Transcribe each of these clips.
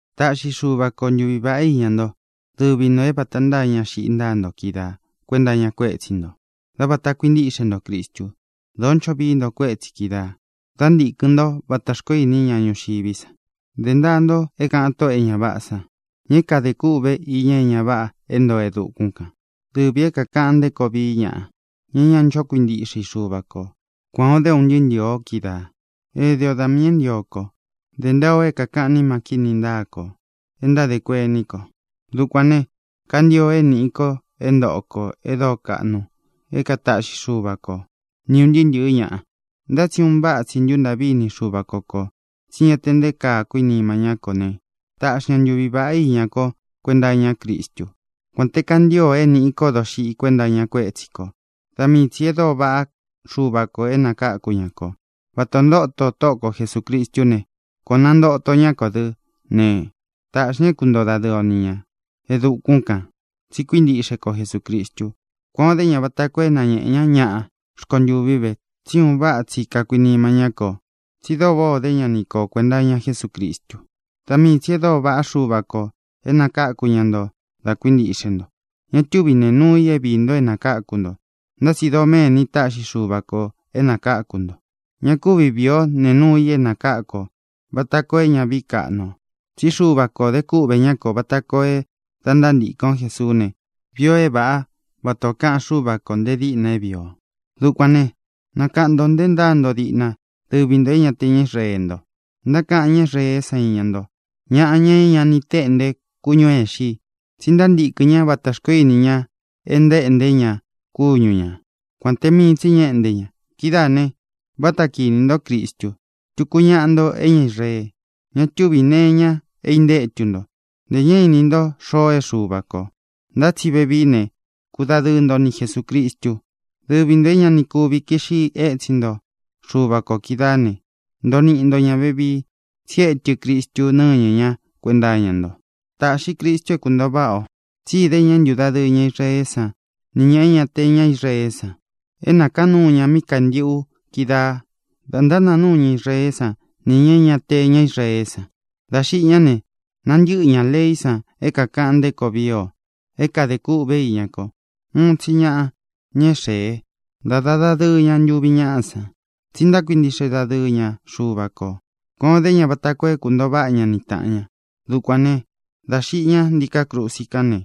Taꞌxi Xuva ko ntuvi vāꞌá iña nto, dɨvi ntō é vata ntáa ña xiꞌi ntáa nto kídaa kuēnta iña kuétsi ntō, dá vāta kuintíꞌxe nto Cristu. Dōó ncho vií nto kuétsī kídaā, dá ntīkɨn ntó vata xkoó ini ñá ñuxiví san. Dé ntaa nto é kāꞌan tóꞌō e ña váꞌā san, ña é kadē kûꞌve iña é ña váꞌā é ntoo e dukún kān, dɨvī é kākaꞌan nté koo vií ñaꞌa, ña é ña ncho kuintíꞌxe i Xuva kō. Kuān o dé o, ūn ntɨɨ́ ntɨ̄ɨ o, kídaā. Éde o da miī é ntio kō. Dē ntaa o é kākaꞌán nima kíni ntáa kō, e ntádē kuení kō. Dukuān ne, kantio é nīꞌi ko é ntōꞌo ko e dóo kaꞌnu é kataꞌxi Xuva ko, ni ūn ntɨɨ́ ntɨ̄ɨ́ ka ñaꞌa. Ntá tsi un váꞌa tsi ntúntaꞌví ini Xuva ko kō, tsí ña te nté kaa kakuinima ñá kō ne, taꞌxi ña ntuvi vāꞌá iña ko kuenta iñá Cristú, kuān te kantío é nīꞌi ko doxiꞌi kuenta iña kuétsi kō. Da mii tsī e dóo vaꞌá Xuva kō é nakakū ñá kō. Vata ō ntóto Tóꞌo ko Jesūcristú ne, kuan ō nántoto ña kó dɨ ne, taꞌxi ña é kuntoo dadɨɨ o ni ñā e dukún kān, tsi kuíntiꞌxe ko Jesūcristu. Kuan ō dé ña vata koo é nañēꞌe ñá ñaꞌa rkontuví ve tsí un váꞌa tsi kakuinima ñá kō, tsi dóo váꞌā ó de ña ni ko kuenta iña Jesúcristu. Da mii tsī e dóo vaꞌá Xuva kō é nakakū ñá nto da kuíntiꞌxe nto. Ña túvi nēe nuu i é vīi mii nto é nākáku nto, ntá tsi doméni táꞌxi Xuva kō é nākáku nto. Ña kúvi vīi o nee nuu i é nākáku ō, vata koo é ña vií kaꞌnu ō. Tsí Xuva kō de kúꞌvē ñá kō vata koo é da ntántīkɨn o Jesuú ne, vii ō é vāꞌá, vata ō kaꞌan Xúva kō nte díꞌna é vīi o. Dukuān né, nakaꞌan ntō nte ntáa nto díꞌna, dɨvi ntō é ña te ña Israeé nto. Ntákaꞌan ñá Israeé san iña ntó “ñaꞌa, ña é ña ni téꞌnte kúñū é īxi i”, tsi ntántīkɨn ña vata xkoó ini ña e ntaéꞌnté ña kúñu ña, kuān te mii tsi ñá éꞌnte ña. Kidáā ne, váta kīni ntó Cristu. Tuku ñaꞌa nto é ña Israee. Ña túvī nee iña é intétu nto, ntē ña ni iní nto xoo é Xuva kō. Ntá tsi vevií ne, kudadɨɨ nto ni Jesūcristu. Dɨvi ntō é ña ni kuvi kiꞌxi étsin nto Xuva kō kídaā né, ntoo niꞌi nto ñā vevii, tsi étɨ Cristu nɨ́ñɨ ña kuenta iña nto. Tāꞌxi Cristu é kuntōo váꞌa ō, tsí idé ña é ntūdadɨɨ ña Israeé san nī ña e ña te ña Israeé san. É nākaán nuu ña míꞌi kāntiꞌu kídaā da ntánāa núu ña Israeé san nī ña é ña te ña Israeé san. Dā xiꞌi ñá ne, nantɨ́ꞌɨ ñā leí san é kākaꞌan nté koo vii o, é kadē kûꞌve íña ko. Uun tsi ñaꞌa, ña é xēe, ntáda dadɨɨ ña ntuvi ñáꞌa san, tsi ntákuintiꞌxe dadɨɨ ña Xuva kō. Kuān o dé ña vata koo é kuntōo váꞌa ña ni tāꞌan ña. Dukuān né, dā xiꞌi ña ntíkā krusi kán ne,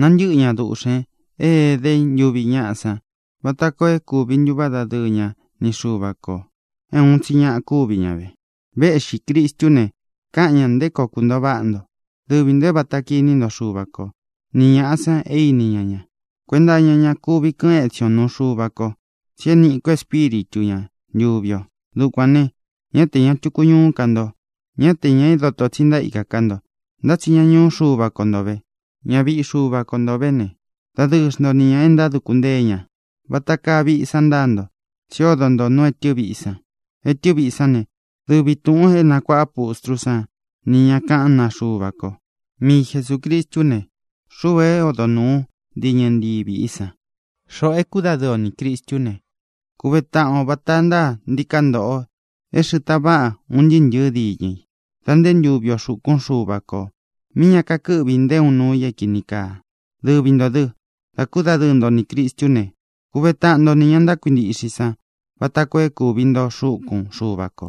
nantɨ́ꞌɨ ña duꞌxēn é ēdé ntuvi ñáꞌa san vata koo é kūvi ntuváꞌa dadɨɨ ña ni Xuva kō. É uun tsi ñaꞌa kúvi ña ve. Véꞌxī Cristú ne, kaꞌan ña nté koo kuntōo váꞌa nto, dɨvi ntō é vata kiní nto Xuva ko, ni ñāꞌa san é ini ñá ña. Kuenta iña ña kuvi kɨ́ꞌɨn etsin o nuu Xuva ko, tsi é niꞌi ko Espíritu ña, ntuvi ō. Dukuān ne, ñá te ñā tuku ñuú ka nto, ñá te ñā é doto tsi ntaíka ká nto, ntá tsi ña ñuú Xuva ko nto vē. Ña víꞌi Xuva ko nto vē ne, dadɨɨ xnto ni ñā e ntáduku ntée ña. Vata kaa viꞌi san ntáa nto, tsí odo nto nú etɨ viꞌi san. Etɨ viꞌi sán ne, dɨvi tūꞌun é nakuāꞌa pustrú san nī ña kaꞌán naa Xuva ko. Mii Jesūcristú ne, xuu é odo nūu diñɨ ntii viꞌi san. Xoꞌō é kudadɨɨ o nī Cristú ne, kuve taꞌan o vāta ntáa ntiká ntoꞌo é xɨ̄ꞌɨ́ taꞌan vaꞌa un ntɨɨ́ ntɨ̄ɨ́ diñɨ i, da nté ntuvi o xūkún Xuva kō míꞌi ña kakɨ́ꞌvi nté uun nuu i é kīni kaa. Dɨvi ntō dɨ, dá kudadɨɨ nto nī Cristú ne, kuve taꞌan nto nī ña ntákuintiꞌxe i san vata koo é kūvi nto xúkun Xuva kō,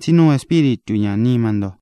tsí nuu Espíritu ñā nima nto.